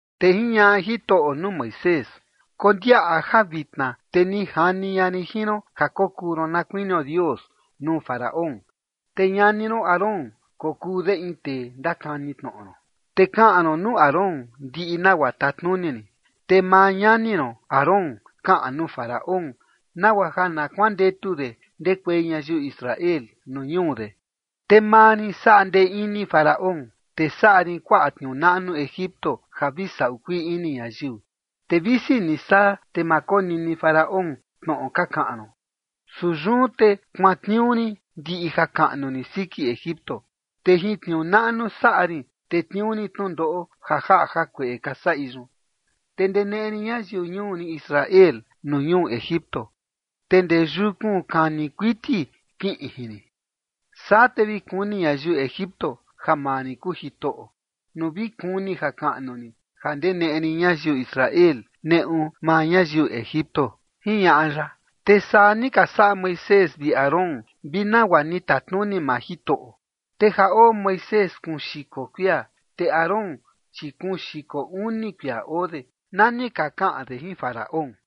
Te jiñaꞌa Jitoꞌo nuu Moisés: ―Kondiaꞌa ja vitna te ni jani ña rin jin ron ja kokuu ron na kuinio Dios nuu Faraón, te ñani ron Aarón kokuu de in tee ndakani tnoꞌo ron. Te kaꞌan ron nuu Aarón ndiꞌi nagua tatnuni rin, te maa ñani ron Aarón kaꞌan nuu Faraón, nagua ja na kuandetu de ndekuei ñayiu Israel nuu ñuu de. Te maa rin saꞌa ndee ini Faraón, te saꞌa rin kuaꞌa tniuu naꞌnu Egipto ja vi saꞌu kuii ini ñayiu. Te visi ni saa, te ma konini Faraón tnoꞌo ka kaꞌan ron. Su yun te kuantniuu rin ndiꞌi jakaꞌnu rin siki Egipto, te jin tniuu naꞌnu saꞌa rin tetniuu rin tnundoꞌo ja jaꞌa jakueꞌe ka saꞌi yun. Te ndeneꞌe rin ñayiu ñuu rin Israel nuu ñuu Egipto, te ndee yukun kani kuiti kiꞌin jin rin. Saa te vi kuni ñayiu Egipto ja maa rin kuu Jitoꞌo, nuu vi kuni jakaꞌnu rin ja ndeneꞌe rin ñayiu Israel neꞌu maa ñayiu Egipto ―jiñaꞌa ya. Te saa ni ka saꞌa Moisés vi Aarón vi nagua ni tatnuni maa Jitoꞌo. Te ja oo Moisés kuun xiko kuia, te Aarón, chi kuun xiko uni kuia oo de, na ni ka kaꞌan de jin Faraón.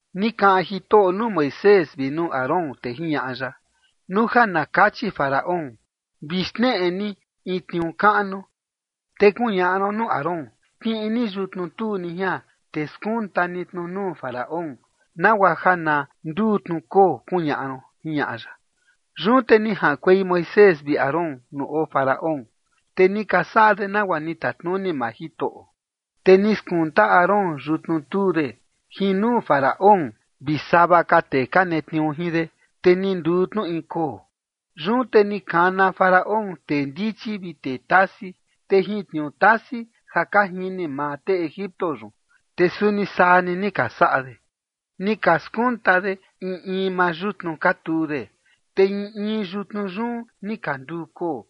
Ni kaꞌan Jitoꞌo nuu Moisés vi nuu Aarón, te jiñaꞌa ya: ―Nuu ja na kachi Faraón: “Vi xneꞌe ni in tniuu kaꞌnu”, te kuñaꞌa ron nuu Aarón: “Kiꞌin ni yutnu tuu ni jian, te skunta ni tnu jin nuu Faraón, nagua ja na nduu tnu koo”, kuñaꞌa ron ―jiñaꞌa ya. Yun te ni jaꞌankuei Moisés vi Aarón nuu oo Faraón, te ni ka saꞌa de nagua ni tatnuni maa Jitoꞌo. Te ni skunta Aarón yutnu tuu de jin nuu Faraón vi sava ka tee ka netniuu jin de, te ni nduu tnu in koo. Yun te ni kana Faraón tee ndichi vi tee tasi, te jin tniuu tasi ja ka jini maa tee Egipto yun, te suni saa ni ni ka saꞌa de. Ni ka skunta de in in maa yutnu ka tuu de, te in in yutnu yun ni ka nduu koo.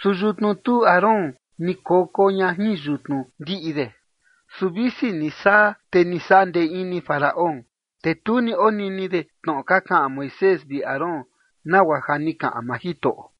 Su yutnu tuu Aarón ni koko ña jin yutnu ndiꞌi de. Su visi ni saa, te ni saꞌa ndee ini Faraón, te tu ni onini de tnoꞌo ka kaꞌan Moisés vi Aarón, nagua ja ni kaꞌan maa Jitoꞌo.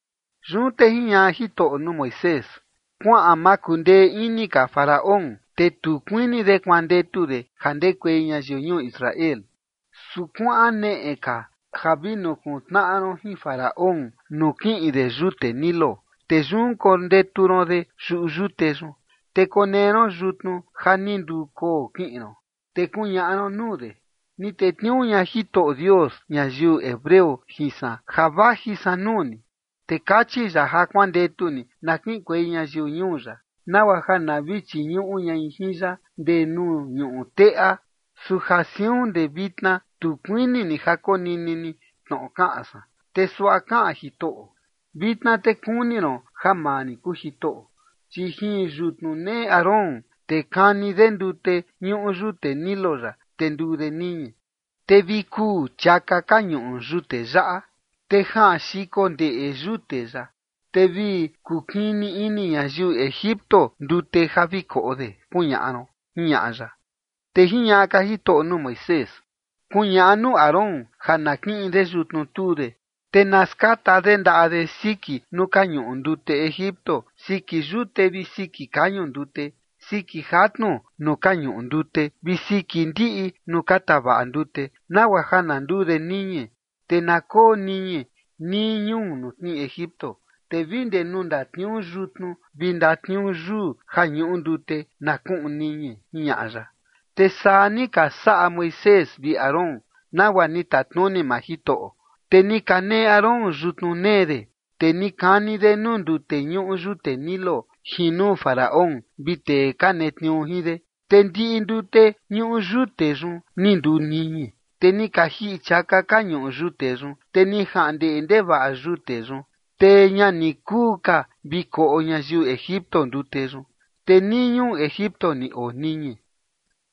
Yun te jiñaꞌa Jitoꞌo nuu Moisés: ―Kuaꞌan makundee ini ka Faraón, te tu kuini de kuandetu de ja ndekuei ñayiu ñuu Israel. Su kuaꞌan neꞌe ka ja vi nukuntnaꞌa ron jin Faraón nuu kiꞌin de yute Nilo. Te yun kondetu ron de yuꞌu yute yun, te konee ron yutnu ja ni nduu koo kiꞌin ron. Te kuñaꞌa ron nuu de: “Ni tetniuu ña Jitoꞌo Dios ñayiu hebreo jin san ja vaji san nuu ni, te kachi ya ja kuandetu ni na kiꞌinkuei ñayiu ñuu ya, nagua ja na vi chiñuꞌu ñai jin ya ndee nuu ñuꞌu teꞌa. Su ja siun ndee vitna tu kuini ni ja konini ni tnoꞌo kaꞌan san. Te suaꞌa kaꞌan Jitoꞌo: Vitna te kuni ron ja maa rin kuu Jitoꞌo. Chi jin yutnu nee Aarón, te kani de ndute ñuꞌu yute Nilo yaꞌa, te nduu de niñi. Te vi kuu chiaka ka ñuꞌu yute yaꞌa, te jaꞌan xiko ndeꞌe yute yaꞌa, te vi kukini ini ñayiu Egipto ndute ja vi koꞌo de”, kuñaꞌa ron ―jiñaꞌa ya. Te jiñaꞌa ka Jitoꞌo nuu Moisés: ―Kuñaꞌa nuu Aarón ja na kiꞌin de yutnu tuu de, te na skata de ndaꞌa de siki nuu ka ñuꞌu ndute Egipto siki yute vi siki kañu ndute, siki jatnu nuu ka ñuꞌu ndute vi siki ndiꞌi nuu ka tavaꞌa ndute, nagua ja na nduu de niñi, te na koo niñi nii ñuu nuu tnii Egipto, te vi ndee nuu ndatniuu yutnu vi ndatniuu yuu ja ñuꞌu ndute na kuꞌun niñi ―jiñaꞌa ya. Te saa ni ka saꞌa Moisés vi Aarón nagua ni tatnuni maa Jitoꞌo. Te ni kaneꞌe Aarón yutnu nee de, te ni kani de nuu ndute ñuꞌu yute Nilo jin nuu Faraón vi tee ka netniuu jin de, te ndiꞌi ndute ñuꞌu yute yun ni nduu niñi. Te ni ka jiꞌi chiaka ka ñuꞌu yute yun, te ni jaꞌan ndeꞌe ndevaꞌa yute yun, te ña ni kuu ka vi koꞌo ñayiu Egipto ndute yun. Te nii ñuu Egipto ni oo niñi.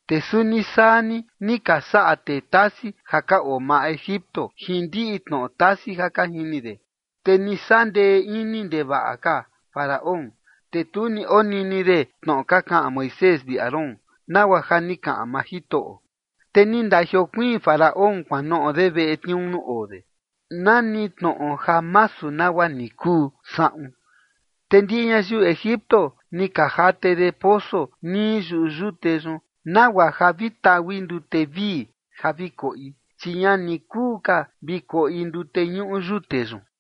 Te suni saa ni, ni ka saꞌa tee tasi ja ka oo maa Egipto jin ndiꞌi tnoꞌo tasi ja ka jini de. Te ni saꞌa ndee ini ndevaꞌa ka Faraón. Te tu ni onini de tnoꞌo ka kaꞌan Moisés vi Aarón, nagua ja ni kaꞌan maa Jitoꞌo. Te ni ndajiokuiin Faraón kuanoꞌo de veꞌe tniuu nuu oo de, nani tnoꞌo ja masu nagua ni kuu saꞌun. Te ndiꞌi ñayiu Egipto ni ka jate de poso nii yuꞌu yute yun, nagua ja vi taui ndute vii ja vi koꞌi, chi ña ni kuu ka vi koꞌi ndute ñuꞌu yute yun.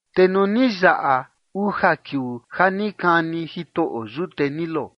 Te nuu ni yaꞌa uja kiuu ja ni kani Jitoꞌo yute Nilo,